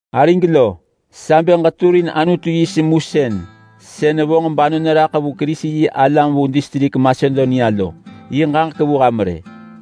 Arig lo, sa bë ġeturin Anutu yi semusën sën vonġ banon raḳ vu Kerisi-yi-alam vu distrik Masedonia lo yi ġaġek vu ham rë.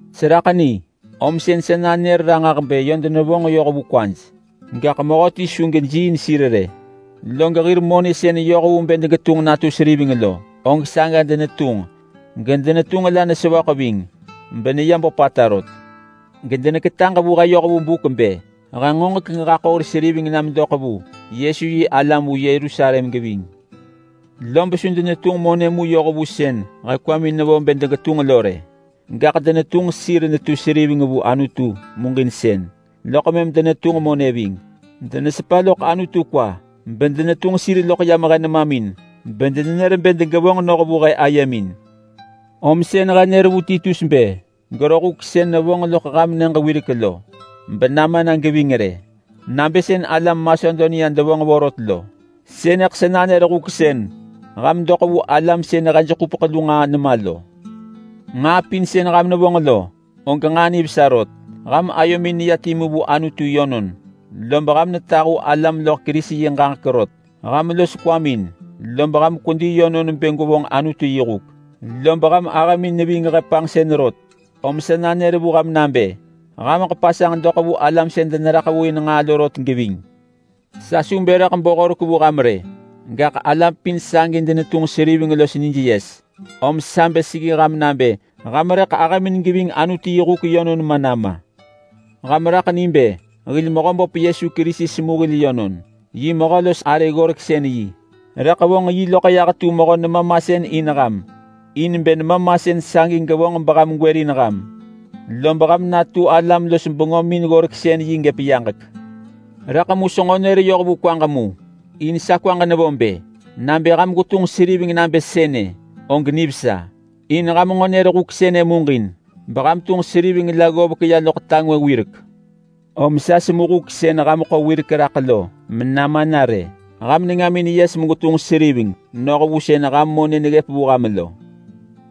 Seraḳ ni om sën sa nanër sir ranġah bë yö denevonġ yoh vu kwaj, gaḳ mehöti su gejiiin sir rë, log hir monë sën yoh vu bë degetunġ natu seriveng lo, og saga denetunġ gedenetunġ la nesevöḳ ving beneya böpata rot. Gedeneketaġ vu he yoh vu buk bë he ngoġek geġaḳo hir seriveng na medoḳ vu Yesu-yi-alam vu Yerusalem geving. Lob su denetunġ monë mu yoh vu sën he kwamin nevo bë degetunġ lo rë, gaḳ denetunġ sir netu seriveng vu Anutu muġinsën, loḳ mëm denetunġ monë ving. Denesepa loḳ Anutu kwa bedenetunġ sir loḳ yam he nemamin bedenër bë degevonġ noh vu he ayemin. Om sën he nër vu Titus bë gero huk sën nevonġ loḳ ham nyëġ wirek lo benama na geving rë. Nabë sën alam Masedonia devonġ vorot lo. Sënëḳ sa nanër huk sën ham doḳ vu alam sën hej ḳupeḳ lu nġaa ma lo. Nġaa pin sën ham nevonġ lo, og nġaa nivesa rot. Ham ayomin neya timu vu Anutu yönon, lob ham netahu alam loḳ Kerisi yi ġaġek rot. Ham los kwamin, lob ham kwedi yönon bë gwevonġ Anutu yi huk, lob ham ahëmin neving he panġsën rot, om sa nanër vu ham nabë hameḳ pasanġ doḳ vu alam sën deneraḳ vu in nġaa lo rot geving. Sa su bë rëḳ bo horek vu ham rë! Gaḳ alam pin sagi denetunġ seriveng los nij yes, om sa bë seggi ham nabë ham rëḳ ahëmin geving Anutu yi huk yönon ma nama. Ham raḳ ni bë hil Mehöböp Yesu Kerisi semu hil yönon. Yi mehö los arë ggoreksën-yi rëḳ vonġ yi loḳ yah tu mehö nema masën in ham, in bë nema masën sagi gevonġ beham gwërin ham, lob ham natu alam los bengömin ggoreksën-yi gëp yaġek. Rëḳ mu senġo nër yoh vu kwaġ mu, in sa kwaġ nevo bë: Nabë ham gwetunġ seriveng nabë sënë, og nivesa, in ham nġo nër huk sënë muġin beham tunġ seriveng la ggovek ya loḳ ta ngwë wirek. Om ham semu huk sën ham ḳo raḳ wirek lo menama na rë. Ham nengamin yes megwetunġ seriveng noh vu sën ham monë neggëp vu ham lo.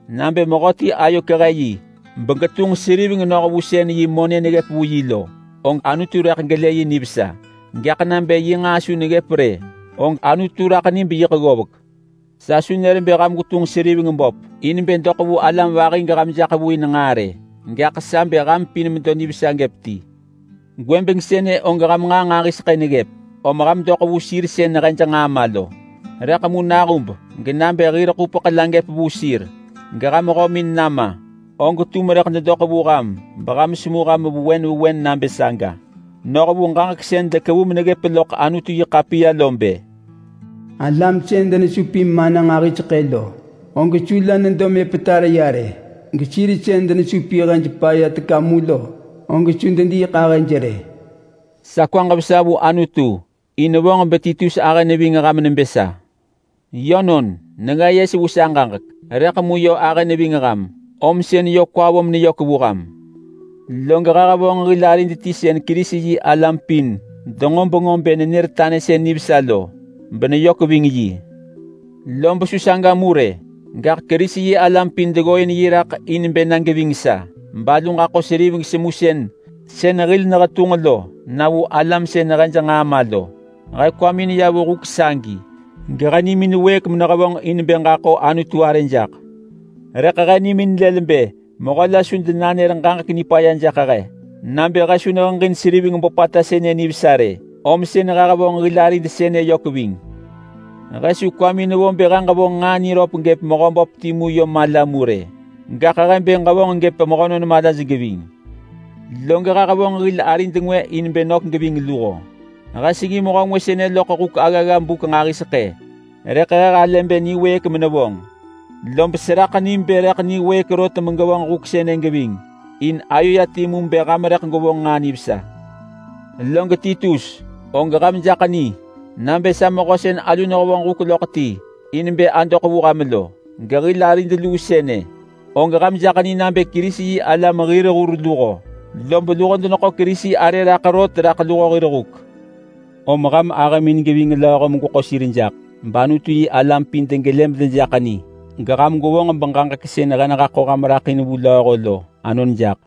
Nabë mehöti ayo kehe yi begetunġ seriveng noh vu sën yi monë neggëp vu yi lo, og Anutu rëḳ gelë yi nivesa. Gaḳ nabë yi nġaa su neggëp rë, og Anutu raḳ ni beyiḳ ggovek. Sa su nër bë ham gwetunġ seriveng böp in bë doḳ vu alam vahi geham jaḳ vu in nġaa rë, gaḳ sa bë ham pin medo nivesa gëp ti. Gwëbeng sënë og ham nġaa nġahiseḳë neggëp, om ham doḳ vu sir sën hej nġaa ma lo. Rëḳ mu nahub genabë hir ḳupeḳ la gëp vu sir geham hömin nama, og tum rëḳ dedoḳ vu ham beham semu ham vewen vewen nabë saga. Noh vu ġaġek sën dekevu meneggëp loḳ Anutu-yi-ḳapiya lo bë, “Alam sën denesupin mana nġahiseḳë lo, og su la nedo mepetar ya rë, gesir sën denesupin hej paya teka mu lo, og su dediiḳahëj rë.” Sa kwaġ vesa vu Anutu in vonġ beTitus ahë neving ham nebë sa. Yönon, nenga yes vu sa ġaġek, rëḳ mu yö ahë neving ham, om sën yö kwa vo meneyök vu ham. Log he hevonġ hil arid ti sën Kerisi-yi-alam pin denġo bengö bë nenër tanësën nivesa lo beneyök ving yi. Lob su saga mu rë, gaḳ Kerisi-yi-alam pin deggooin yi raḳ in bë na geving sa balu ġaḳo seriveng semusën sën hil nehetunġ lo na vu alam sën hej nġaa ma lo. He kwamin ya vu huk sagi gehe nimin wëëk menehevonġ in bë ġaḳo Anutu arë jaḳ. Rëḳ he nimin lël bë mehö la su denanër ġaġek nipaya jaḳ he nabë he su neheġin seriveng böpata sënë nivesa rë, om sën he hevonġ hil arid sënë yök ving. He su kwamin vo bë he ġevonġ nġaa niröp gëp Mehöböp timu yö mala mu rë, gaḳ he bë ġevonġ gëp mehönon malaj geving. Log he hevonġ hil arid ngwë in bë nök geving luho. He seggi mehö ngwë sënë loḳ huk aggagga buk nġahiseḳë, rëḳ he halë bë niwëëk menevonġ. Lob seraḳ ni bë rëḳ niwëëk rot megevonġ huk sënë geving, in ayo ya timu bë ham rëḳ gwevonġ nġaa nivesa. Log Titus, og ham jaḳ ni nabë sa mehö sën alu nehevonġ huk loḳ ti in bë adoḳ vu ham lo. Gehil arid luu sënë, og ham jaḳ ni nabë Kerisi-yi-alam hir hur luho, lob luho deneḳo Kerisi arë raḳ rot raḳ luho hir huk. Om ham ahëmin geving lööho megweḳo sir jaḳ, bAnutu-yi-alam pin degelë medejaḳ ni. Geham gwevonġ beġaġek sën he nehaḳo ham raḳ vu lööho lo anon jaḳ.